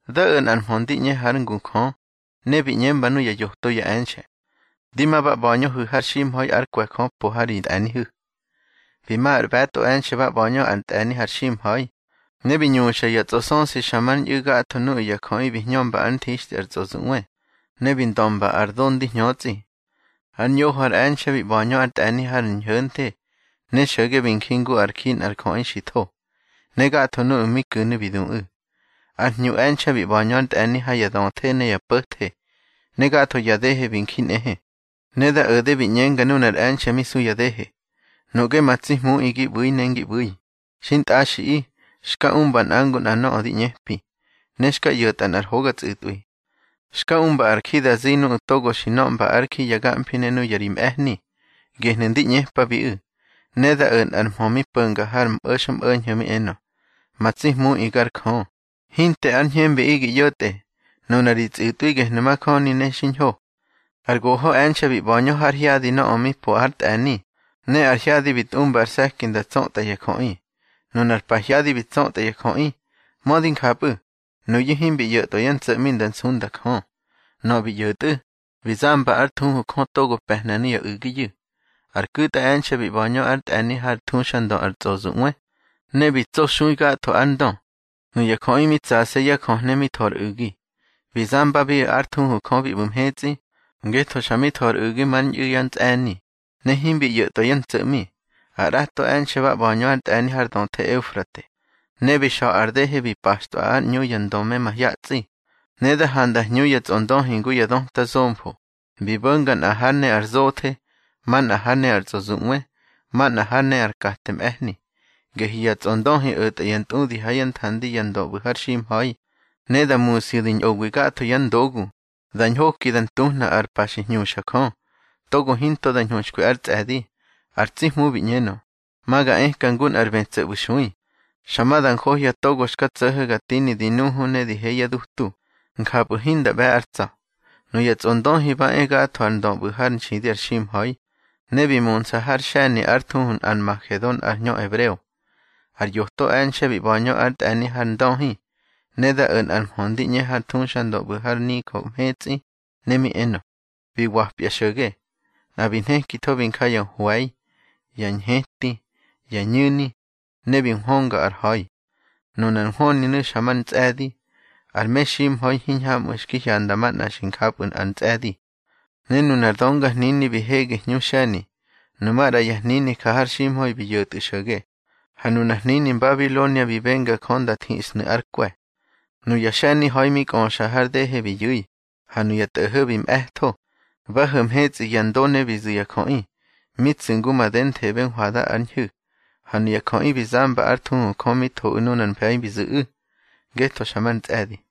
Da o̱ nꞌar mhö ndi ꞌñe hár ngu Jö, ne bi ꞌñemba nuya yoto ya e̱nxe̱: —Di ma ba ꞌba̱ñöhu̱ har ximha̱i ár kwe̱ Jö po ha ri tꞌe̱nihu̱. Bi ma ar ꞌbe̱tꞌo e̱nxe̱ ba ꞌba̱ñö ár tꞌe̱ni har ximha̱i. Ne bi ñuxa ya tsꞌosösi xa mar ñꞌu̱ gatho nuꞌu̱ ya jöꞌi bi hñömba ár nthixtꞌi ar tsꞌozuꞌwe, ne bi ndömba ar do ndi hñötsꞌi. Ar ñoho ar e̱nxe̱ bi ꞌba̱ñö ár tꞌe̱ni har ñho̱nthe, ne xo̱ge bi nji ngu ár ji nꞌar jöꞌi xi tho, ne gatho nuꞌu̱ mi ku̱nu̱ bi duꞌu̱. Ar hñu e̱nxe̱ bi ꞌba̱ñö ár tꞌe̱ni ha ya döthe ne ya po̱the, ne gatho yá dehe bi nji nꞌehe. Ne da o̱de bi ꞌñenga nunar e̱nxe̱ mi su ya dehe: —Nuꞌge ma tsi Hmuꞌi gi ꞌbu̱i ne ngi ꞌbu̱i, xintꞌaxiꞌi, xka umba nꞌa ngu nꞌa nöꞌö di ꞌñepi, ne xka ꞌyo̱tꞌa nꞌar hoga tsꞌu̱tꞌwi. Xka umba ar ji da zi nuꞌu̱ togo bi nöꞌmba ár ji ya gamfi ne nuya ri mꞌe̱hni. Gehnu̱ ndi ꞌñepabiꞌu̱. Ne da o̱ nꞌar mhö mi po̱nga har mꞌo̱xmꞌo̱ñho̱ mi enö: —Ma tsi Hmuꞌi gar Jö, hinte ar ñhembiꞌi gi ꞌyo̱tꞌe. Nuna ri tsꞌu̱tꞌwi gehnu̱ majöni ne xiñho. Ar goho e̱nxe̱ bi ꞌba̱ñö har hyadi nöꞌö mi po hár tꞌe̱ni, ne ar hyadi bi tꞌumba ar se̱ki nda tsötꞌa ya jöꞌi. Nunar pahyadi bi tsötꞌa ya jöꞌi. Mödi njapꞌu̱, nuyu̱ himbi ꞌyo̱tꞌwa yá ntso̱ꞌmi nda nsunda Jö. Nöꞌö bi ꞌyo̱tꞌu̱, bi zamba ár thuhu Jö togo pe̱hna nuya u̱giyu̱. Ar ku̱tꞌa e̱nxe̱ bi ꞌba̱ñö ár tꞌe̱ni hár thuxandö ar tsꞌozuꞌwe, ne bi tsoxui gatho ár ndö. Nuya jöꞌi mi tsase̱ yá jöhne mi tho ar u̱gi. Bi zambabiꞌu̱ ár thuhu Jö bi ꞌbu̱ mhetsꞌi, ngetho xa mi tho ar u̱gi mar ñꞌu̱ yá ntsꞌe̱ni, ne himbi ꞌyo̱tꞌwa yá ntso̱ꞌmi. Ar ꞌrato e̱nxe̱ ba ꞌba̱ñö ár tꞌe̱ni har döthe Eufrate, ne bi xa̱ ar dehe bi paxtꞌwa ár ꞌñu ya ndö me mahyatsꞌi. Ne da handa hñu ya tsꞌondöhi ngu ya döta zomfo, bi bo̱nga nꞌa hár ne ar zothe, manꞌa hár ne ar tsꞌozuꞌwe, manꞌa hár ne ar kate mꞌe̱hni. Gehyu̱ ya tsꞌondöhi o̱tꞌa ya ntꞌudi ha yá nthandi ya ndö ꞌbu̱ har ximha̱i, ne da musyu̱ di ñꞌowi gatho yá ndogu, da ñhoki da ntuhna ar pa xi hñuxa Jö, togo hinto da ñhuxkwi ár tsꞌe̱di. Ar tsi Hmu bi ꞌñenö: —Ma ga ëka ngu nꞌar bë tso̱ ꞌbu̱ nxui. Xa ma da njohya togo xka tso̱ho̱ ga tini di nuhu ne di he yá dutu, njapꞌu̱ hinda ꞌbe̱ ár tsa̱. Nuya tsꞌondöhi ba e̱ gatho ya ndö ꞌbu̱ hár nxidi ar ximha̱i, ne bi munsa har xe̱ni ár thuhu Nꞌarmagedon har hñö ebreo. Ar yoto e̱nxe̱ bi ꞌba̱ñö ár tꞌe̱ni har ndöhi, ne da o̱ nꞌar mhö ndi ꞌñe har thuxandö ꞌbu̱ har nijö mhetsꞌi, ne mi enö: —Bi wapya xo̱ge. Nꞌa bi nhekitho bi nja ya hwe̱i, ya ñheti, ya ñu̱ni, ne bi nhwönga ar ha̱i. Nunar nhwöninu̱ xa mar ntsꞌe̱di, ar meximha̱i hiñhamꞌu̱ xki hyanda manꞌa di njapꞌu̱ ár ntsꞌe̱di. Ne nunar döngahnini bi hege hñu xe̱ni, nu maꞌra ya hnini ja har ximha̱i bi yo̱tꞌu̱ xo̱ge. Ha nunar hnini Mbabilonia bi benga Jö da thiꞌsnu̱ ár kwe̱. Nuya xe̱ni ha̱i mi kꞌöxa har dehe bi yu̱i, ha nuya tꞌo̱ho̱ bi mꞌe̱tho. Ba ho̱ mhetsꞌi ya ndo ne bi zu̱ ya jöꞌi, mi tsu̱ ngu madenthebe hwada ár ñhu̱. Ha nuya jöꞌi bi zamba ár thuhu Jö mi thoꞌu̱ nunar mfe̱i bi zu̱ꞌu̱, ngetho xa mar ntsꞌe̱di.